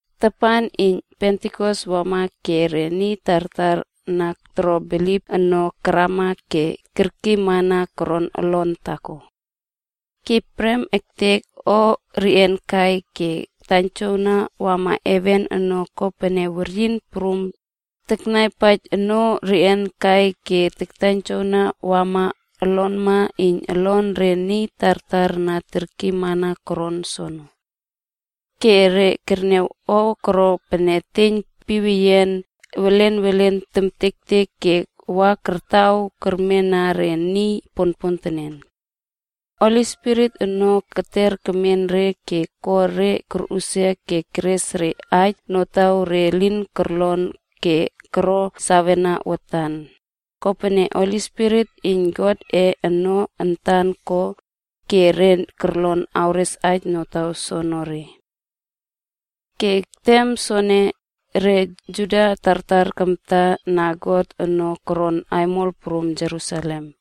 Tapan iyn Pentikosa wama ke re niy tartar na toro bilip ono karama ke kerkiymana koron olon taako. Ke prem ektek o reꞌian kai ke taiynjowna wama heven ono kopene weryin prum taklapaij ono reꞌian kai ke taiynjowna kawa olonma iyn olon re niy tartar na kerkiymana koron soono. Ke re kerniaw o koro pene eteiyn piweyian welen welen kemtektek ke wa kartaw kermena re niy ponpontenen. Holi Spirit ono keter kemen re ke ko re korꞌusia ke keres re aij notaw re lin korlon ke koro sawena watan, kopene Spirit iyn Godꞌe ono antan ko, ke re korlon awres aij notaw soonore. Ke tem soene, re Juda tartar tamta na God ono koron aimol prum Jerusalem.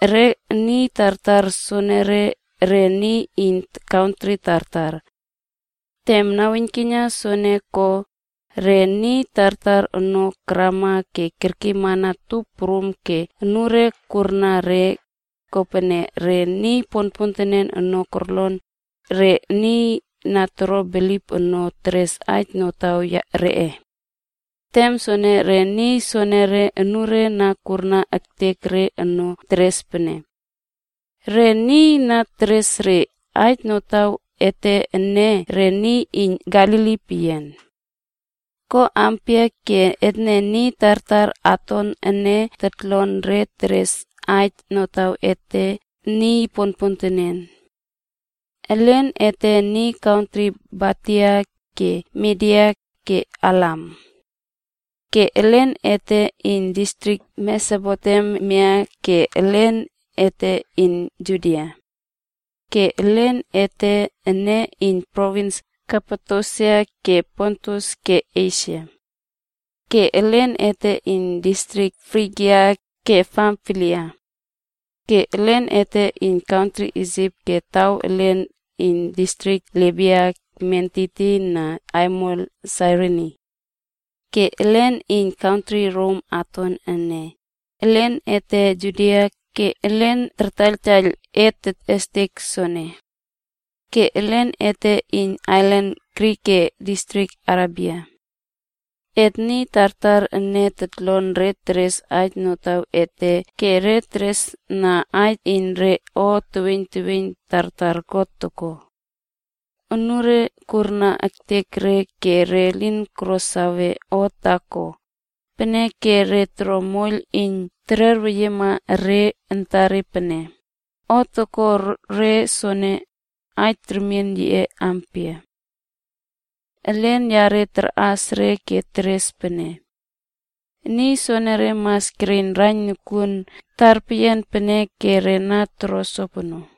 Re niy tartar soenere, re niy iyn kantri tartar. Tem naweiynkiyna soene ko, re niy tartar ono karama ke kerkiymana tup prum ke anure kurna re, kopene re niy ponpontenen ono korlon re niy na toro bilip ono teres aij notaw reꞌe. Tem soono re niy soonore anure na kurna ektek re ono teres pene, “Re niy na teres re aij notaw ete ene re niy iyn Galili peyian. Ko ampia ke etne niy tartar aton ene totlon re teres aij notaw ete niy ponpontenen? Elen ete iyn kantri Partia, ke Midia, ke Elam. Ke elen ete iyn distrik Mesopotemia ke elen ete iyn Judia. Ke elen ete ene iyn provins Kapadosia ke Pontus ke Esia. Ke elen ete iyn distrik Frigia ke Pamfilia. Ke elen ete iyn kantri Isip ke taw elen iyn distrik Libia ekmen tiytiyna aimol Sairini. Ke elen iyn kantri Rom aton ene, elen ete Juda ke elen tartaiyltaiyl et tetꞌestek soono. Ke elen ete iyn ailan Krit ke distrik Arebia. Et niy tartar ene totlon re teres aij notaw ete ke re tereswawna aij iyn re o teweiyn tartar God ko.” Anure kurna ektek re ke re lin koro sawe o taako, peneke re toro moiyl iyn tererweyiema re antare pene, “O toko re soono, aij remien yiꞌe ampia?” Elen yare karꞌas re ke teres pene, “Niy soonore mas kereiyn raiyn nokuon tarpeyian peneke re na toro sopono.”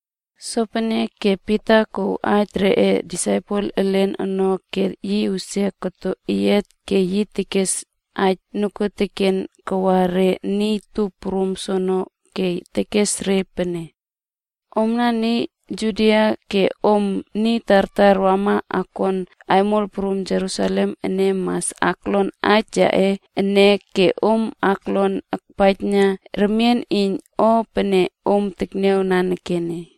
Sopeneke Pita kouw aij reꞌe aposel elen ono ke yi usia koto eyiat ke yi kes aij nokuoteken kawa re niy tup prum soono ke tekes re pene, “Omna niy Juda ke om niy tartar wama akon aimol prum Jerusalem ene mas aklon aij yaꞌe ene ke om kolon akniawpaij remien iyn o pene om tekniaw nanekene.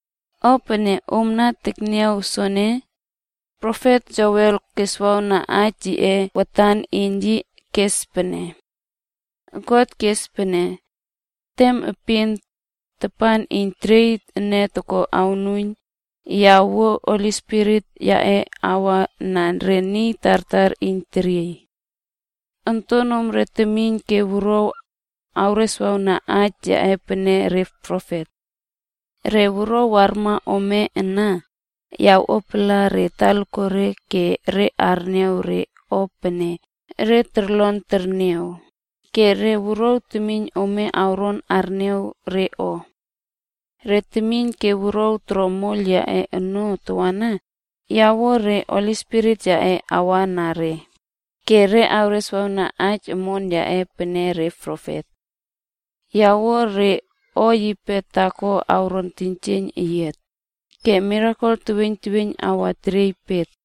O pene om na tekniaw soene, profet Joel keswawna aij yiꞌe watan iyn yi kes pene: ‘God kes pene, “Tem epin, tem iyn teriey ene toko awnuiyn, ya awuo Spirit yaꞌe awa na re niy tartar iyn teriey. Ontonomre temiyn ke wuruaw, awreswawna aij yaꞌe pene re profet. Re wuruaw warma ome ana, ya awꞌuapala re talakuare ke re arniaw re o pene re toron terniaw ke re wuruaw teweiyn ome awron arniaw re o. Re temiyn ke wuruaw toro moiyl yaꞌe ono tawana, ya awuo re Spirit yaꞌe awa na re ke re awreswawna aij omon yaꞌe pene re profet. Ya awuo re o yipe taako awron teiynjieiyn eyiat ke mirakel teweiyn teweiyn awa teriey pet.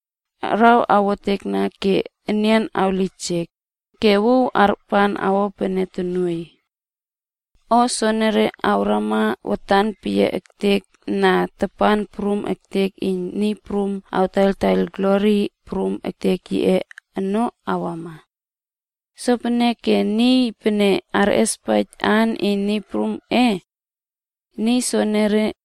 Araw awotekna ke nian awlijek ke wuw arpan awo pene tonuoiy. O soenere awrama watan peyiaektek na tapan prum ektek iyn Niy Prum awtaiyltaiyl glori prum ektek yiꞌe ono awama. Sopeneke niy pene arꞌespaij aan iyn Niy Prumꞌe, Niy soonore,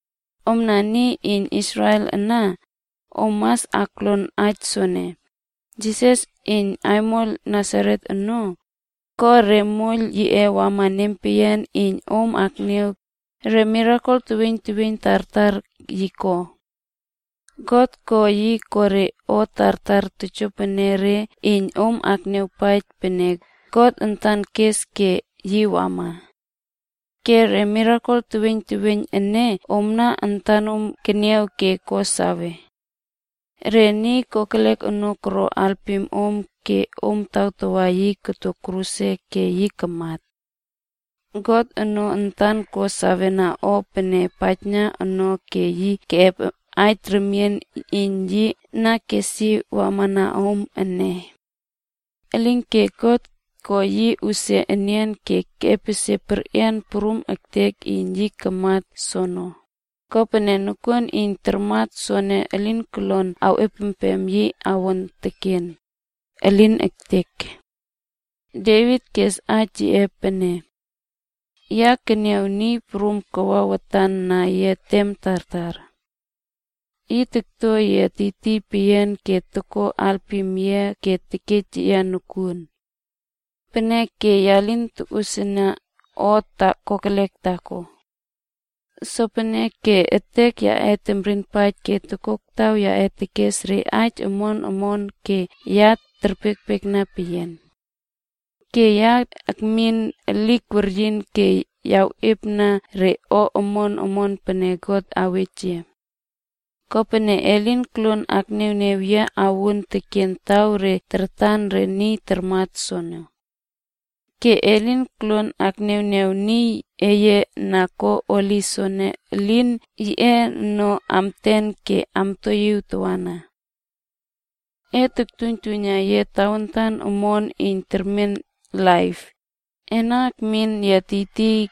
“Omna niy iyn Israel ana om mas aklon aij soene, Jisas iyn aimol Nasaret ono, ko re moiyl yiꞌe wama nempeyian iyn om keniaw re mirakel teweiyn teweiyn tartar yi ko. God ko yi ko re o tartar tojoenere iyn om akniawpaij pene God antan kes ke yi wama. Ke re mirakel teweiyn teweiyn ene omna antanom keniaw ke ko sawe. Re niy kokelek ono koro alpim om ke om tawtawa yi koto kruse ke yi kamat. God ono antan ko sawena o ene paijna no ke yi keꞌep aij remien iyn yi na kes yi wamana om ene. Elinke God ko yi usia enian ke epesie perꞌian prum ektek iyn yi kamat soono, kopene nokuon iyn tarmat soono elin kolon awꞌepem yi awon teken. Elin ektek! Devit kes aij yiꞌe pene, ‘Ya keniaw Niy prum takwa watan na yia tem tartar. Yi tokto yia tiytiy peyian ke toko alpim yia ke tekej yia nokuon. Peneke ya lin tokosiena o kokelek taako. Sopeneke etek yaꞌe kemrinpaij ke tokoktaw yaꞌe tekes re aij omon omon ke ya terpiekpiekna peyian. Ke ya awmin elik weryin ke awꞌiepna re o omon omon pene God awej yia. Kopene e lin koluon akniawniaw yia awuon teken taw re tartan re niy tarmat soono. Ke e lin koluon akniawniaw niy eye na ko holi soono elin yiꞌe ono amten ke amtoiyiw tawana. E tuiynjuiyna yia tawantan omon iyn termen laip, ena akmin yia tiytiy,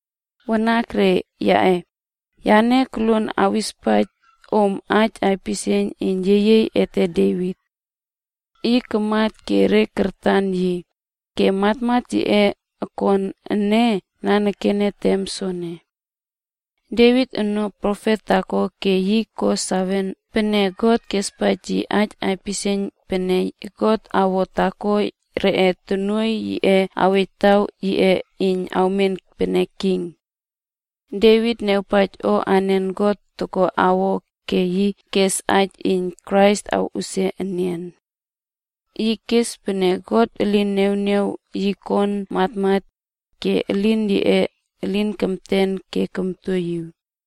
“Wanakre yaꞌe, yane koluon awispaij om aij aipisieiyn iyn yeyiey ete Devit. Yi kamat ke re kartan yi, ke matmat yiꞌe okon ene nanekene tem soene. Devit ono profet taako ke yi ko sawe pene God kespaij yi aij aipisieiyn pene God awo taako reꞌe tonuoiy yiꞌe awej taw yiꞌe iyn awmen pene king. Devit niawpaij o anen God toko awo, ke yi kes aij iyn Krais awꞌusia enian. Yi kes pene God lin niawniaw yi kon matmat, ke elin yiꞌe elin kemten ke komtoiyiw.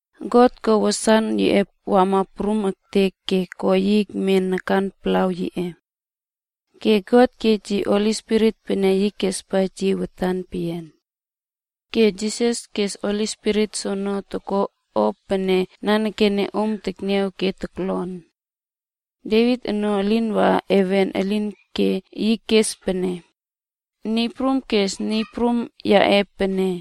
God ko wasan yiꞌe kawa prum ektek ke ko yi ekmen nakan palaw yiꞌe. Ke Taja God kej yi Holi Spirit pene yi kespaij yi watan peyian. Ke Jisas kes Holi Spirit soono toko o pene nanekene om tekniaw ke toklon. Devit ono elin waꞌa heven elinke yi kes pene, ‘Niy Prum kes Niy Prum yaꞌe pene,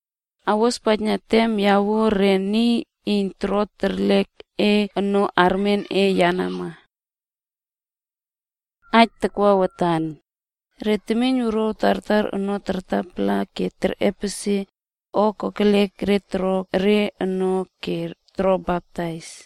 awospaijna tem ya awuo re niy iyn toro terlek e ono armen e yenama.” ’”d Re temiynwuruaw tartar ono kartapala ke kerꞌepesie o kokelek re toro re ono ke koro baptais.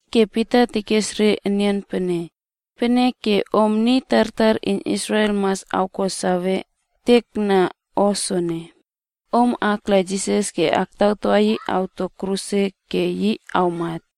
Ke Pita tekes re enian pene, “Peneke, om niy tartar iyn Israel mas awko sawe ektekna o soene: Om kala Jisas ke tawtawa yi koto kruse ke yi kamat.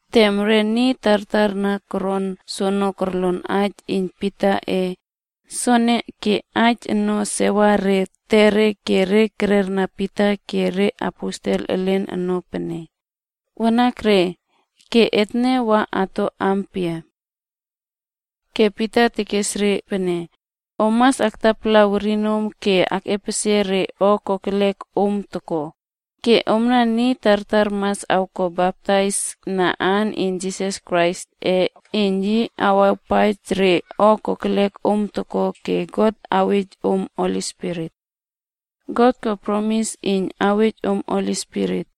Tem re niy tartar na koron soono korlon aij iyn Pitaꞌe soene ke aij ono sewar re etere ke re tererna Pita ke reaposel elen ono pene, “Wanakre! Ke etne wa ato ampia?” Ke Pita tekes re pene, “Om mas aktapala werinom ke akꞌepesie re o kokelek om toko, ke omna niy tartar ana mas awko baptais na aan iyn Jisas Kraisꞌe iyn yi awawpaij re o kokelek om toko ke God awej om Holi Spirit. God kespaij iyn yi awej om Holi Spirit.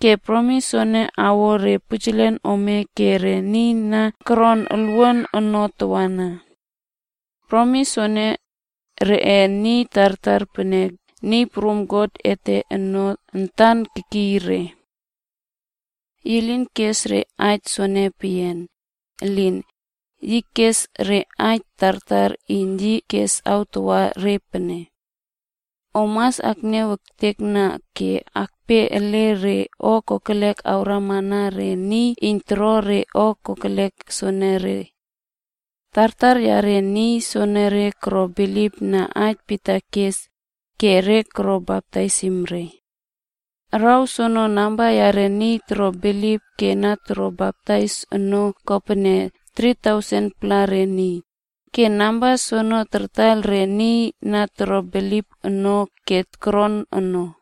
Ke promis soene awa re pujelen ome ke re niy na koron olwuan ono tawana. Promis soene, reꞌe niy tartar pene Niy Prum God ete ono antan awkiy re.” Yi lin kes re aij soene peyian, elin, yi kes awtawa re aij omon omon tartar pene, “Om mas akniaw ektekna ke akpe ele re o kokelek awrama na re niy iyn toro re o kokelek soenere.” Tartar yare niy soenere koro bilipna aij Pita kes, ke re koro baptaisim re. Araw soono namba yare niy koro bilip ke na koro baptais ono kopene 3000-pla re niy, ke namba soene kartaiyl re niy na koro bilip ono ke koron ono.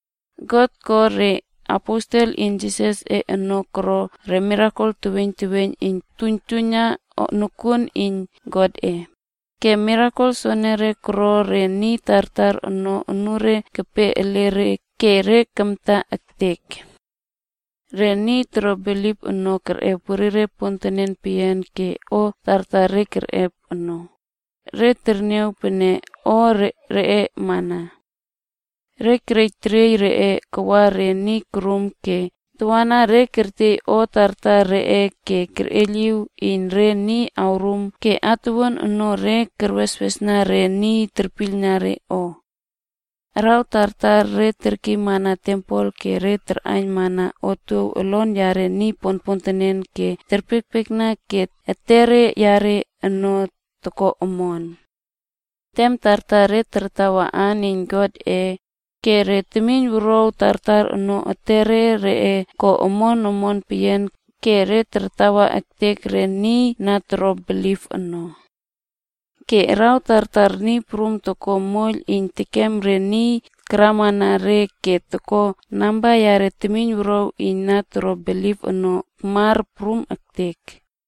God ko re aposel iyn Jisasꞌe ono koro re mirakel teweiyn teweiyn iyn tuiynjuiyna nokuon iyn Godꞌe, ke mirakel soenere koro re niy tartar ono unure kepe ele re ke re kamta ektek. Re niy toro bilip ono kerꞌep werire pontenen peyian ke o tartar re kerꞌep ono, re terniaw pene o reꞌe mana. Re kerej teriey reꞌe kawa re niy korum ke tawana re kertiey o tartar reꞌe ke terꞌeiyliw iyn re niy torum ke atuwuan ono re terweswesna re niy terpiylna re o. Araw tartar re terkiymana tempel ke re tarꞌaiynmana otuow olon yare niy ponpontenen ke re terpiekpiekna ke etere yare ono toko omon. Tem tartar re tartawa aan iyn Godꞌe, ke re temiyn wuruaw tartar ono etere reꞌe ko omon omon peyian ke re tartawa ektek re niy na toro bilip ono. Ke araw tartar Niy Prum toko moiyl iyn tekem re niy akramana re ke ko namba reꞌe temiynwuruaw iyn na toro bilip ono kamar prum ektek.